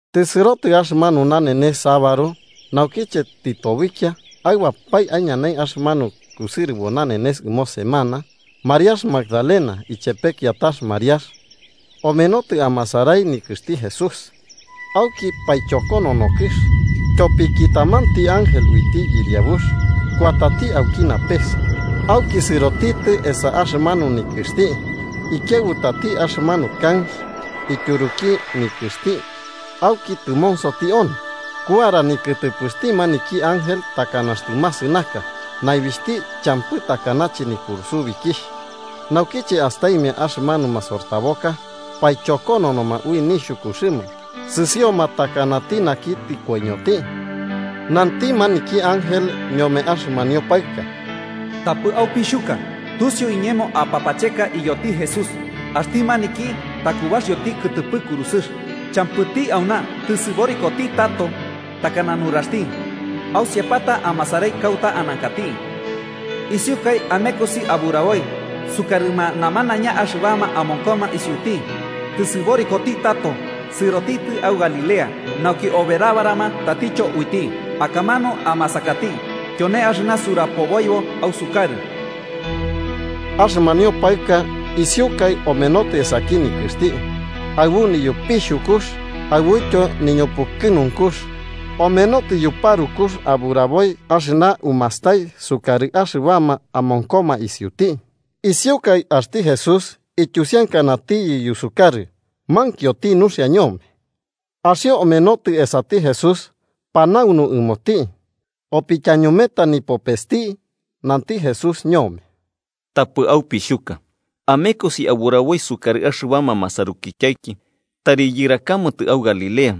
Tɨsɨrotɨ axɨmanu nanenes sabaru, naukiche tɨtobikia aɨbapae aiñanai axɨmanu kusɨrɨbo nanenes ɨmo semana, Mariax Magdalena ichepe kiatax Mariax omenotɨ amasarai nikɨxti Jesús. Auki paichokonono kɨx, tyopiki tamanti ángel uiti Yɨriabux kuatati auki napes, auki sɨrotitɨ esa axɨmanu nikɨxti, ikiaɨbutati axɨmanu kanx ityuruki nikɨxti auki tɨmonsoti onɨ. Kuara nikɨtɨpɨxti maniki ángel takana axtɨ masɨnaka, naibixhti champɨ takanache nipurusubikixh. Naukiche astaimia axɨmanuma masortaboka, paichokononoma ui nixhukuxɨma sɨsioma takanati naki tɨkoiñoti. Nanti maniki ángel ñome axɨmanio paɨka: –Tapɨ aupixhuka. Tusiu iñemo apapacheka iyoti Jesús, axti maniki takubaxioti kɨtɨpɨ kurusɨx. Champɨti auna, tɨsɨborikoti tato, takana nuraxti. Ausiapata amasarai kauta anankati. Isiukai amekosi aburaboi sukarɨma namanaiña axɨbama amonkoma isiuti: ‘Tɨsɨborikoti tato, sɨrotitɨ au Galilea nauki oberabarama tatityo uiti. Akamanu amasakati.’ Tyone axɨna surapoboibo ausukarɨ. Axɨmanio paɨka isiukaɨ omenotɨ esaki nikɨxti, aɨbu niyopixhukux aɨbuityo niñupukɨnunkux, omenotɨ yuparukux aburaboi axɨna umastai sukarɨma axɨbama amonkoma isiuti. Isiukai, axti Jesús ityusiankanatiyɨ yusukarɨ mankioti nuxia ñome. Axio omenotɨ esati Jesús panaunu ɨmoti, opityañumeta nipopesti, nanti Jesús ñome: –Tapɨ aupixhuka. Amekosi aburaboi sukarɨ axɨbama masarukityaiki tari yɨrakamatɨ au Galilea,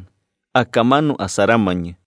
akamanu asaramañɨ.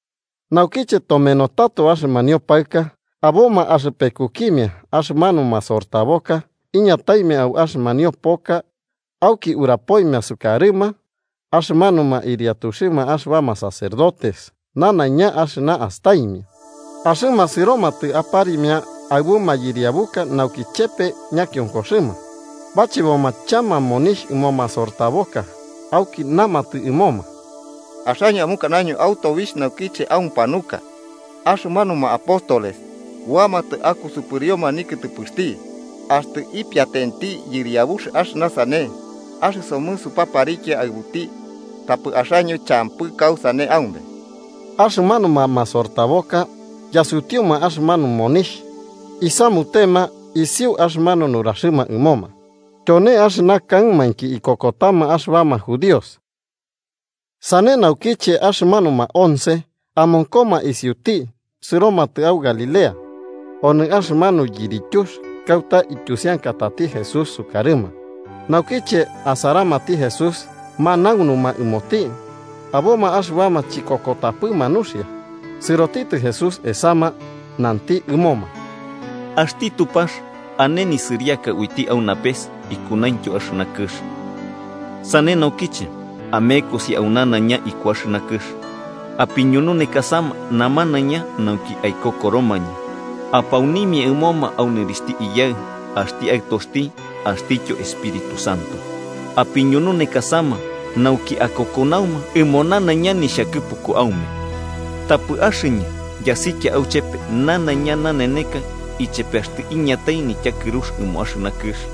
Naukiche tomenotɨ tato axɨmanio paɨka, aboma axɨpekukimia axɨmanuma masortaboka iñataimia au axɨmanio poka auki urapoimia sukarɨma axɨmanuma ɨriatuxɨma axɨbama sacerdotes nanaiña axɨna astaimia. Axɨma sɨromatɨ aparimia aɨbu mayɨriabuka nauki chepe ñakionkoxɨma. Bacheboma chama monixh ɨmo masortaboka, auki namatɨ ɨmoma: –Axaño amukanaño au tobixh naukiche aupanuka, axɨmanuma apóstoles kuamatɨ akusɨpɨrioma nikɨtɨpɨxti. Axtɨ ipiatenti yɨriabux axɨna sane, axɨsomɨ supaparikia aɨbuti, tapɨ axaño champɨ kausane aume. Axɨmanuma masortaboka yasutiuma axɨmanu monixh isamutema isiu axɨmanu nuraxɨma ɨmoma. Tyone axɨna kaɨmainki ikokotama axɨbama judíos. Sane naukiche, axɨmanuma once amonkoma isiuti sɨromatɨ au Galilea onɨ axɨmanu yirityux kauta ityusiakatati Jesús sukarɨma. Naukiche asaramati Jesús, manaunuma ɨmoti, aboma axɨbama chikokotapɨma nuxia. Sɨrotitɨ Jesús esama, nanti ɨmoma: –Axti Tupax ane nisɨriaka uiti au napes ikunaintyo axɨna kɨx. Sane naukiche, amekosi au nanaiña iku axɨna kɨx, apiñununekasama namanaiña nauki aikokoromañɨ. Apaunimia ɨmoma au nɨrixhti Iyaɨ, axti Aɨtoxti axtityo Espíritu Santo. Apiñununekasama nauki akokonauma ɨmo nanaiña nixhakɨpuku aume. Tapɨ axɨñɨ yasikia auchepe nanaiña naneneka, ichepe axtɨ iñatai nityakɨrux ɨmo axɨna kɨx.